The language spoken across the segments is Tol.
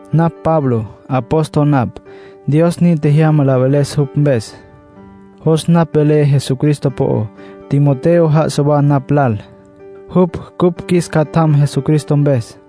Napj Pablo. Apóstol napj, Dios nin tjejyama la veles jupj mpes. Jos napj velé Jesucristo po'ó. Timoteo já'asa wa napj lal. Jupj cupj qjuis catjam Jesucristo mpes.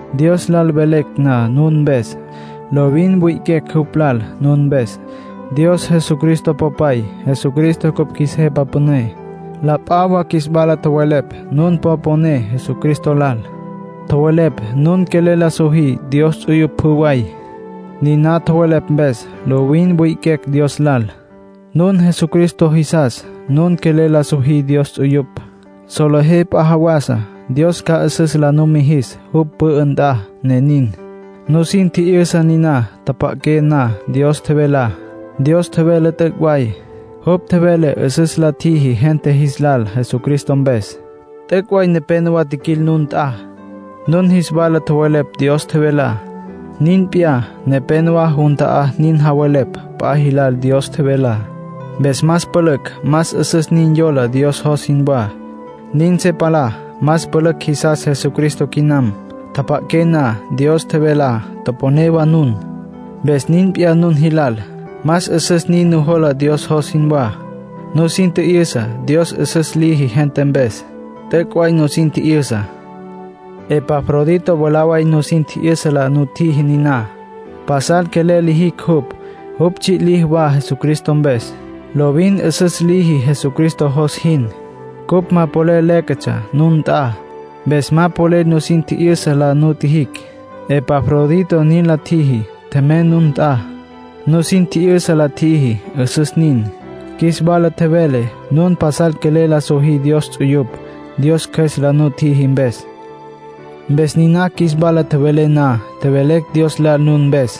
Dios lal velecj na nun mpes, lovin wi'iquecj jupj lal nun mpes. Dios Jesucristo Popay. Jesucristo cupj qjuis Jepa Püné. La p'a wa qjuis wala tjowelepj nun po poné Jesucristo lal. Tjowelepj nun quelel la sojí Dios ts'uyupj pjü way. Niná tjowelepj mpes, lovin wi'iquecj Dios lal. Nun Jesucristo jisas, nun quelel la sojí Dios ts'uyupj; solejé p'a jawasa Dios ca 'üsüs la numijis jupj pü'ü nt'a, ne nin. Nusin tji'yüsa niná tjapja'aqué na Dios tjevelá. Dios tjevele, t'üc' way. Jupj tjevele 'üsüs la tjiji gente jis lal Jesucristo mpes. T'üc' way nepénowa tjiquil nun nt'a, nun jis wala tjowelepj Dios tjevelá. Nin p'iyá, nepénowa jun ta'á nin javelepj p'a jilal Dios tjevelá. Mpes más pülücj más 'üsüs nin yola Dios jos jinwá, nin se palá. Más pülücj jisas Jesucristo quinam. Tjapja'aqué na Dios tjevelá, toponé wa nun. Mpes nin p'iyá nun jilal. Más 'üsüs nin nujola Dios jos jinwá. Nusin tji'yüsa Dios 'üsüs liji gente mpes. T'üc' way nusin tji'yüsa. Epafrodito mwalá way nusin tji'yüsa la nutjiji niná. Pasal quelel lijicj jupj. Jupj tsji' liji wa Jesucristo mpes. Lovin 'üsüs liji Jesucristo jos jin. Cupj ma polel léquetsja nun nt'a. Mpes ma polel nusin tji'yüsa la nutjijicj. Epafrodito nin la tjiji; tjemey nun nt'a. Nusin tji'yüsa la tjiji. 'Üsüs nin. Qjuis wala tjevele nun pasal quelel la sojí Dios ts'uyupj, Dios Cjües la nutjiji mpes. Mpes niná qjuis wala tjevele na, tjevelecj Dios lal nun mpes.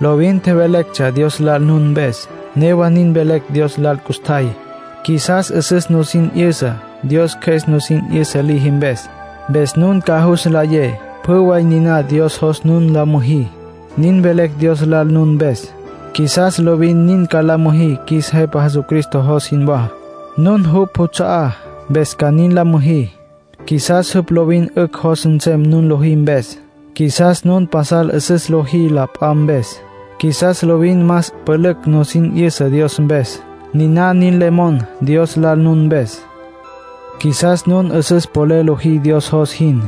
Lovin tjevelectsja Dios lal nun mpes. Newa nin velecj Dios lal custjay. Qjuisas 'üsüs nusin 'yüsa, Dios Cjües nusin 'yüsa liji mpes. Mpes nun ca jus nlayé pjü way niná Dios jos nun la müjí. Nin velecj Dios lal nun mpes. Qjuisas lovin nin ca la müjí qjuis Jepa Jesucristo jos jinwá. Nun jupj juts'a'á, mpes ca nin la müjí. Qjuisas jupj lovin 'ücj jos nsem nun lojí mpes. Qjuisas nun pasal 'üsüs lojí la p'a mpes. Qjuisas lovin más pülücj nusin 'yüsa Dios mpes. Niná nin le monacj Dios lal nun mpes. Qjuisas nun 'üsüs polel lojí Dios jos jin.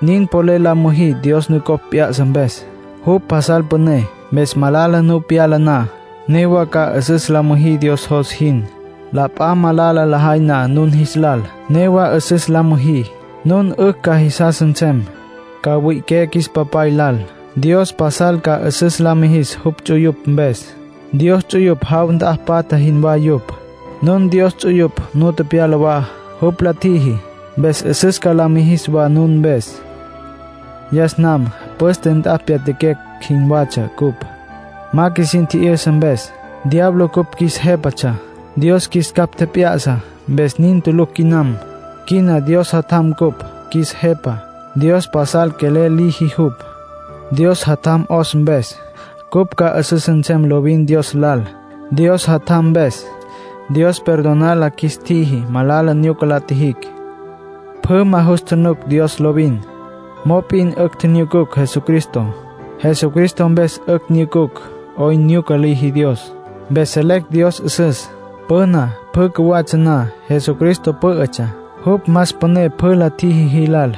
Nin polel la müjí Dios nucopj p'ya'sa mpes. Jupj pasal püné. Mpes malala nu pyala na, newa ca 'üsüs la müjí Dios jos jin. La p'a malala lajay na nun jis lal, newa 'üsüs la müjí. Nun 'ücj ca jisas nsem. Ca mwi'iqué qjuis Papay lal. Dios pasal ca 'üsüs la mijis jupj ts'uyupj mpes. Dios ts'uyupj jaw nt'a patja jinwá yupj. Nun Dios ts'uyupj nu tepyala wa, jupj la tjiji. Mpes 'üsüs ca la mijis wa nun mpes. Yas nam püste nt'a tepyatjaquecj jinwatsja cupj, ma qjuisin tji'yüsa mpes. Diablo cupj qjuis jépatsja. Dios qjuis capj tjep'ya'sa mpes nin tulucj quinam. Quina Dios Jatjam cupj qjuis Jepa. Dios pasal quelel liji jupj. Dios Jatjam 'os mpes, cupj ca 'üsüs nsem lovin Dios lal. Dios Jatjam mpes, Dios perdonar la qjuis tjiji malala nyuca la tjijicj. Pjü ma jus tjunuc Dios lovin. Mop'in 'ücj tjinyucucj Jesucristo; Jesucristo mpes 'ücj nyucucj 'oyn nyuca liji Dios. Mpes selecj Dios 'üsüs. Püna, pjü cjuwatsja na, Jesucristo pǘ'ütsja. Jupj más püné pjü la tjiji jilal.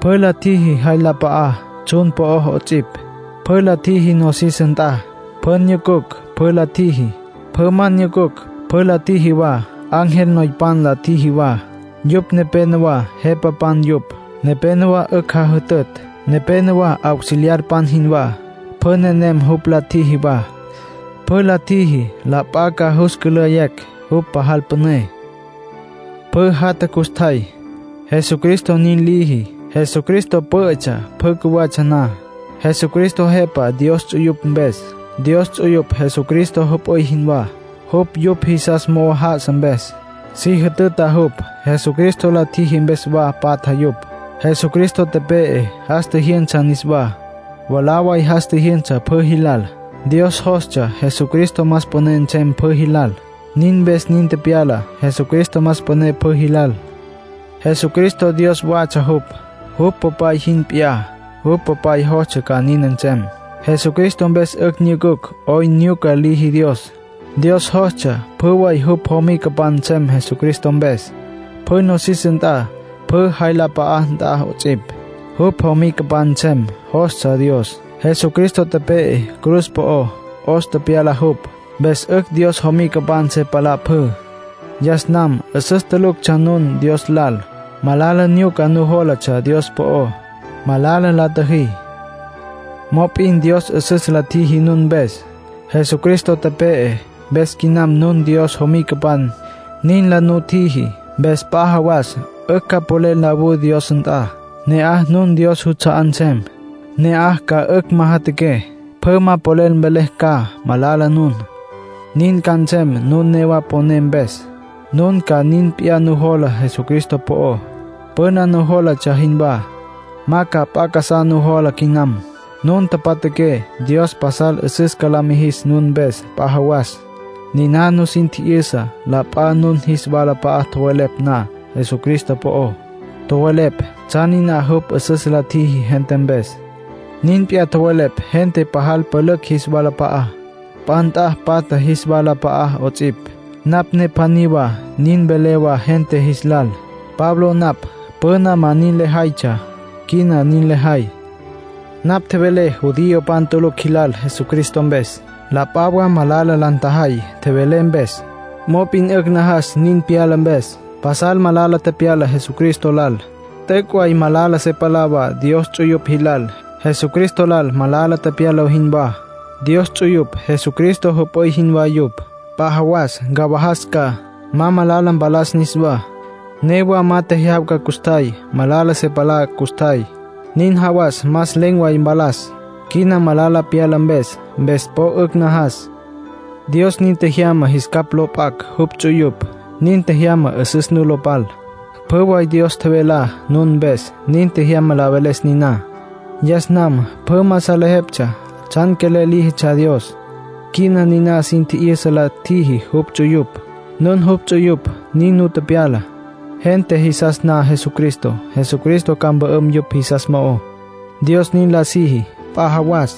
Pjü la tjiji jay la p'a'á, tsjun po'ó 'ots'ipj. Pjü la tjiji nosis nt'a. Pjü nyucucj, pjü la tjiji. Pjü ma nyucucj, pjü la tjiji wa. Ángel noypan la tjiji wa. Yupj nepénowa jepapan yupj. Nepénowa 'ücj jajütütj. Nepénowa auxiliarpan jinwá. Pjü nenem jupj la tjiji wa. Pjü la tjiji la p'a ca jus cülayecj jupj pajal püné. Pjü jatja custjay, Jesucristo nin liji. Jesucristo pǘ'ütsja pjü cjuwatsja na. Jesucristo Jepa Dios ts'uyupj mpes. Dios ts'uyupj Jesucristo jüp'üy jinwá, jupj yupj jisas mo'o já'asa mpes. Si jütüta jupj. Jesucristo la tjiji mpes wa patja yupj. Jesucristo tepe'e, jas tjijyünsa niswá. Mwalá way jas tjijyünsa pjü jilal. Dios jostsja Jesucristo más püné nsem pjü jilal; nin mpes nin tepyala. Jesucristo más püné pjü jilal. Jesucristo Dios watsja jupj, jupj Popay jin p'iyá; jupj Popay jostsja ca nin nsem. Jesucristo mpes 'ücj nyucucj 'oyn nyuca liji Dios. Dios jostsja pjü way jupj jomicapan nsem Jesucristo mpes. Pjü nosis nt'a, pjü jay la p'a'a nt'a 'ots'ipj, jupj jomicapan nsem, jostsja Dios. Jesucristo tepe'e cruz po'ó, 'os tepyala jupj, mpes 'ücj Dios jomicapan se palá pjü. Yas nam 'üsüs tuluctsja nun Dios lal. Malala nyuca nujólatsja Dios po'ó. Malala la tjüjí. Mop'in Dios 'üsüs la tjiji nun mpes. Jesucristo tepe'e, mpes quina nun Dios jomicapan, nin la nutjiji. Mpes p'a jawas 'ücj ca polel nlawú Dios nt'a. Ne'aj nun Dios juts'a'á nsem. Ne'aj ca 'ücj majatjaqué. Pjü ma polel mvelecj ca malala nun. Nin ca nsem nun newa poné mpes. Nun ca nin p'iyá nujola Jesucristo po'ó, püna nujólatsja jinwá. Ma ca p'a casá nujola quinam. Nun tjapja'aqué Dios pajal 'üsüs ca la mijis nun mpes p'a jawas. Niná nusin tji'yüsa la p'a nun jis walap'a'a tjowelepj na Jesucristo po'ó. Tjowelepj tsjan niná jupj 'üsüs la tjiji gente mpes. Nin p'iyá tjowelepj gente pajal pülücj jis walap'a'á, p'a nt'a patja jis walap'a'á 'ots'ipj. Napj ne pjaní wa nin velé wa gente jis lal. Pablo napj. Püna ma nin lejaytsja; quina nin lejay. Napj tjevelé judiopan tulucj jilal Jesucristo mpes. La p'a wa malala la ntjajay tjevelé mpes. Mop'in 'ücj najas nin pyala mpes. Pasal malala tepyala Jesucristo lal. T'üc' way malala se palá wa Dios ts'uyupj jilal, Jesucristo lal malala tepyala jinwá. Dios ts'uyupj Jesucristo jüp'üy jinwá yupj. P'a jawas ncawajas ca, ma malala mpalas niswá. Newa ma tecyawaja custjay, malala se palá custjay. Nin jawas más len̈ way mpalas, quina malala pyala mpes. Mpes po 'ücj najas. Dios nin tjejyama jis capj lo p'acj jupj ts'uyupj. Nin tjejyama 'üsüs nu lo pal. Pjü way Dios tjevelá nun mpes, nin tjejyama la veles niná. Yas nam pjü ma salejeptsja tsjan quelel líjitsja Dios. Quina niná sin tji'yüsa la tjiji jupj ts'uyupj. Nun jupj ts'uyupj, nin nu tepyala. Gente jisas na Jesucristo, Jesucristo ca mpü'üm yupj jisas mo'ó, Dios nin la siji. P'a jawas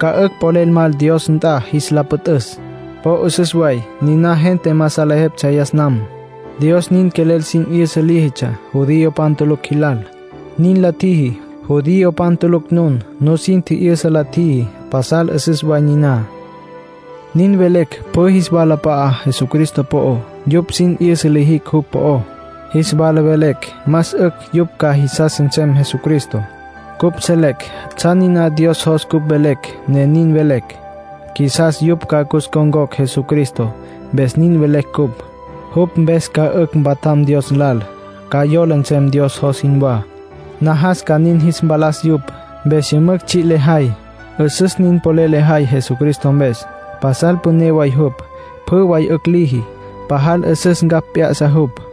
ca 'ücj polel mal Dios nt'a jis la püt'üs. Po 'üsüs way. Niná gente ma salejeptsja yas nam. Dios nin quelel sin 'yüsa líjitsja judiopan tulucj jilal. Nin la tjiji. Judiopan tulucj nun. Nusin tji'yüsa la tjiji, pasal 'üsüs way niná. Nin velecj pjü jis walap'a'á Jesucristo po'ó. Yupj sin 'yüsa lijicj jupj po'ó. Jis wala velecj más 'ücj yupj ca jisas nsem Jesucristo. Cupj selecj tsjan niná Dios jos cupj velecj, ne nin velecj. Qjuisas yupj ca cus ncon̈cocj Jesucristo, mpes nin velecj cupj. Jupj mpes ca 'ücj mpatjam Dios lal. Ca yola nsem Dios jos jinwá. Najas ca nin jis mpalas yupj, mpes yümücj tsji' lejay. 'Üsüs nin polel lejay Jesucristo mpes. Pasal püné way jupj, pjü way 'ücj liji. Pajal 'üsüs ncapj p'ya'sa jupj.